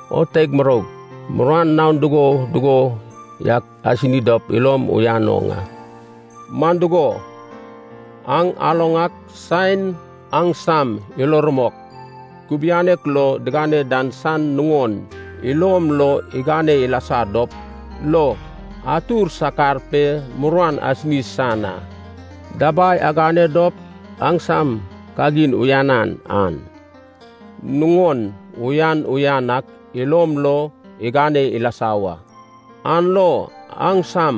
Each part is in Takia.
O teig muroug, muruan naon dugo dugo yak asini dop ilom uyan oŋ a. Man dugo, aŋ aloŋ ak saen aŋsam ilo rumok kubianek lo digane dan san nuŋon ilom lo igane ilasa dop lo atur sakar pe muruan asini san a. Dabai agane dop aŋsam kagin uyanan an, nuŋon uyan uyan ak ilom lo igane ilasa wa, an lo aŋsam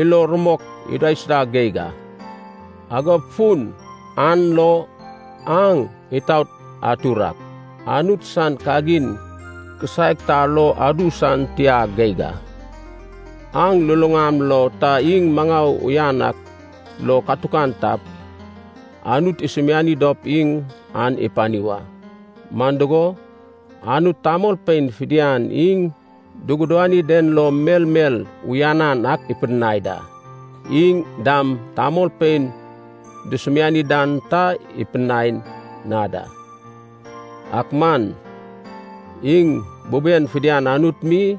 ilo rumok idaisuda geig a. Agop fun an lo aŋ itaot atur ak, Anut san kagin kisaek ta lo adu san tia geig a. Aŋ luluŋam lo ta iŋ maŋau uyan ak lo katukan tap, Anut isumiani dop iŋ an ipani wa. Man dugo, Anut tamolpein fidian iŋ dugudani den lo melmel uyanan ak ipidinai da. Iŋ dam tamolpein dusumiani dan ta ipidai na da. Ak man iŋ buben fidian Anut mi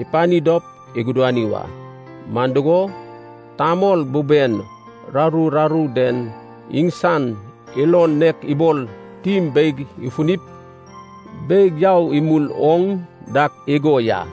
ipani dop igudani wa, man dugo, tamol buben raru raru den iŋsan ilon nek ibol tim beig ifunip beig yau imul oŋ dak igo ya.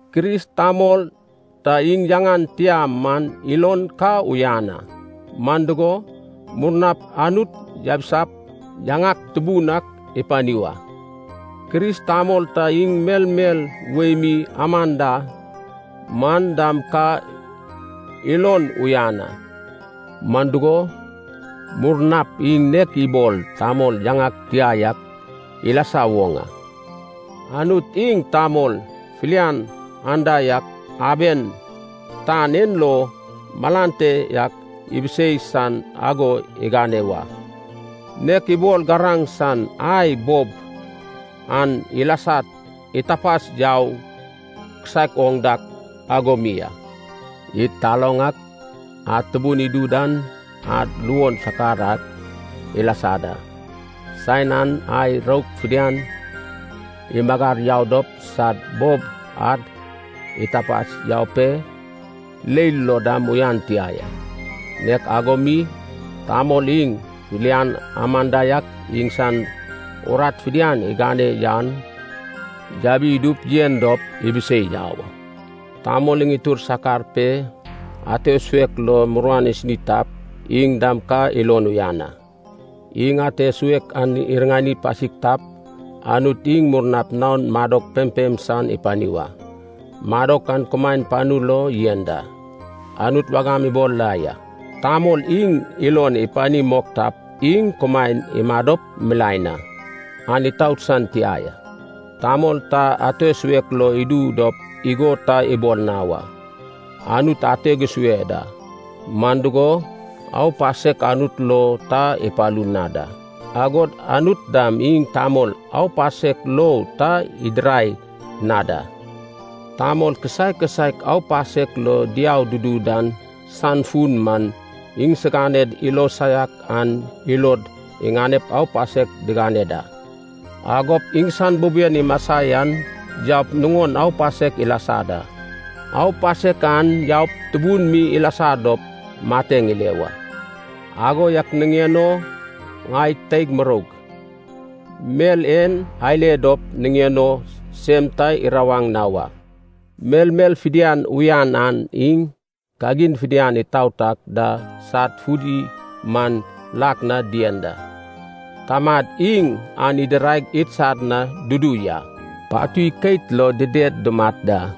Kris tamol ta iŋ yaŋan tia man ilon ka uyan a, man dugo, murnap Anut yabisap yaŋak tubun ak ipani wa. Kris tamol ta iŋ melmel wei mi aman da man dam ka ilon uyan a, man dugo, murnap iŋ nek ibol tamol yaŋan tia yak ilasa woŋ a. Anut iŋ tamol filian anda yak aben tan en lo malan te yak ibisei san ago igane wa, nek ibol garaŋ san ai bob an ilasad itapas yau kisaek oŋ dak ago mi a. Id taloŋ ak, ad tubun idu dan ad luon sakar ak ilasa da. Saen an ai rouk fidian imagar yau dop sad bob ad itapas yau pe leil lo dam uyan tia ya. Nek ago mi tamol iŋ filian aman da yak iŋsan urat fidian igane yan yabi idup yen dop ibisei yau a. Tamol iŋ itur sakar pe, ate suek lo muruan isini tap iŋ dam ka ilon uyan a. Iŋ ate suek an iriŋani pasik tap, Anut iŋ murnap naon madok pempem san ipani wa, madok an kumaen panu lo yen da. Anut wagam ibol la ya, tamol iŋ ilon ipani mok tap iŋ kumaen imadop milaen a, an itout san tia ya. Tamol ta ate suek lo idu dop igo ta ibol na wa, “Anut ateg isue da.” Man dugo, aupasek Anut lo ta ipalu na da, agod Anut dam iŋ tamol aupasek lo ta idirai na da. Tamol kisaek kisaek aupasek lo diau dudu dan san fun man, iŋsiganed ilo saiak an ilod iŋanep aupasek digane da. Agop iŋsan buben imasa yan yaup nuŋon aupasek ilasa da, aupasek an yaup tubun mi ilasa dop mateŋ ile wa. Ago yak niŋen o, ŋai teig muroug, mel en ale dop niŋen o sem ta irawaŋ na wa. Melmel fidian uyanan iŋ kagin fidian itaot ak da sad fudi man lak na dien da, Tamad iŋ an idirai idsad na dudu ya. Patui keit lo dided dumat da.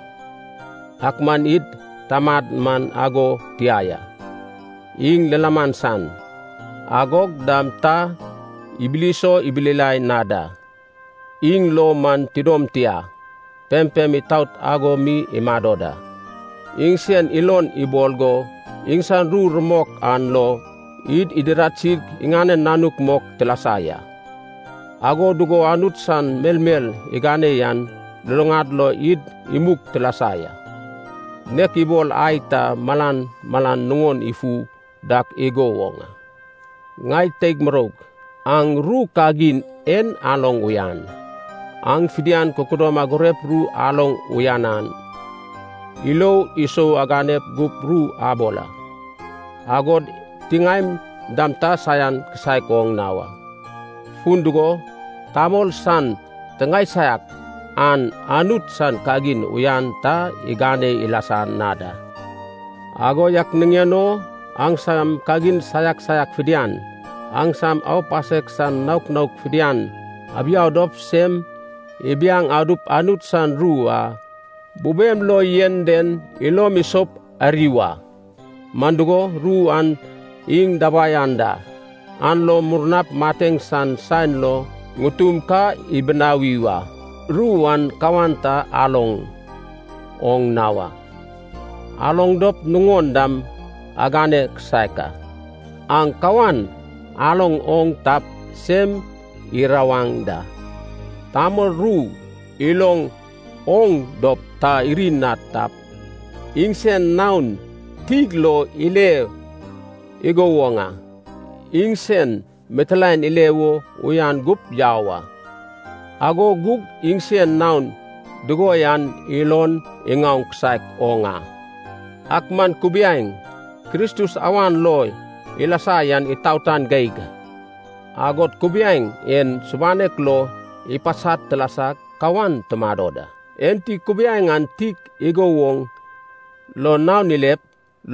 Ak man id Tamad man ago tia ya, iŋ lilaman san, agog dam ta ibilso ibilila na da. Iŋ lo man tidom tia, pempem itaot ago mi imado da. Iŋsen ilon ibol go, iŋsan ru rumok an lo, id idiradsig iŋanen nanuk mok tilasa ya. Ago dugo Anut san melmel igane yan luluŋad lo id imug tilasa ya. Nek ibol ai ta malan malan nuŋon ifu dak igo woŋ a. Ŋai teig muroug, aŋ ru kagin en aloŋ uyan. Aŋ fidian kududom agurep ru aloŋ uyanan, ilo isou agane gup ru abol a, agod tiŋaem dam ta saian kisaek oŋ na wa. Fun dugo, tamol san tiŋae saiak an Anut san kagin uyan ta igane ilasa na da. Ago yak niŋen o aŋsam kagin saiak saiak fidian, aŋsam aupasek san naok naok fidian abiau dop sem ibiaŋ adup Anut san ru a bubem lo yen den ilom isoup ari wa, man dugo, ru an iŋ dabai anda, an lo murnap mateŋ san saen lo ŋutum ka ibinawi wa. Ru an kawan ta aloŋ oŋ na wa, aloŋ dop nuŋon dam agane kisaek a. Aŋ kawan aloŋ oŋ tap, sem irawaŋ da. Tamol ru iloŋ oŋ dop ta iri na tap, iŋsen naon tig lo ile igo woŋ a. Iŋsen mitilaen ile wo uyan gup yau a. Ago gug iŋsen naon dugo yan ilon iŋaoŋ kisaek oŋ a. Ak man kubiaeŋ Kristus awan lo ilasa yan itaotan geig, agod kubiaeŋ en subanek lo ipasad tilasag kawan tumado da. Enti kubiaeŋ an tig igo woŋ lo naon ilep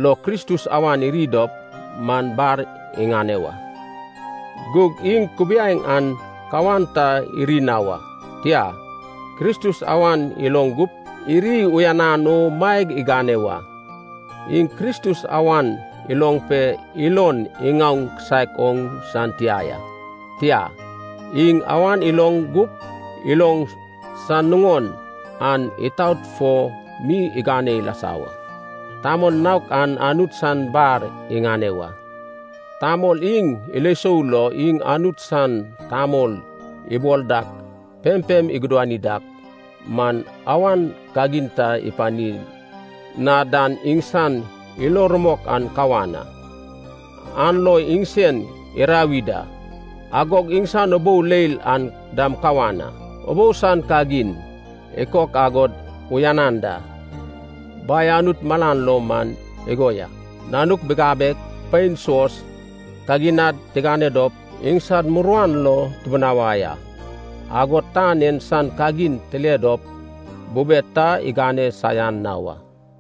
lo Kristus awan iri dop man, bar iŋane wa. Gug iŋ kubiaeŋ an kawan ta iri na wa, tia, Kristus awan iloŋ gup iri uyanan o maeg igane wa. Iŋ Kristus awan iloŋ pe ilon iŋaoŋ kisaek oŋ san tia ya, tia, iŋ awan iloŋ gup iloŋ san nuŋon an itaot fo mi igane ilasa wa. Tamol naok an Anut san bar iŋane wa. Tamol iŋ ilo isou lo iŋ Anut san tamol ibol dak pempem igudani dak man awan kagin ta ipani na dan iŋsan ilo rumok an kawan a, an lo iŋsen irawi da. Agog iŋsan ubou leil an dam kawan a. Ubou san kagin ikok agod uyanan da Bai Anut malan lo man igo ya: nanuk bigabeg, pein suos, kaginad tigane dop iŋsad muruan lo tibinawai a, agod tan en san kagin tile dop bubed ta igane saian na wa.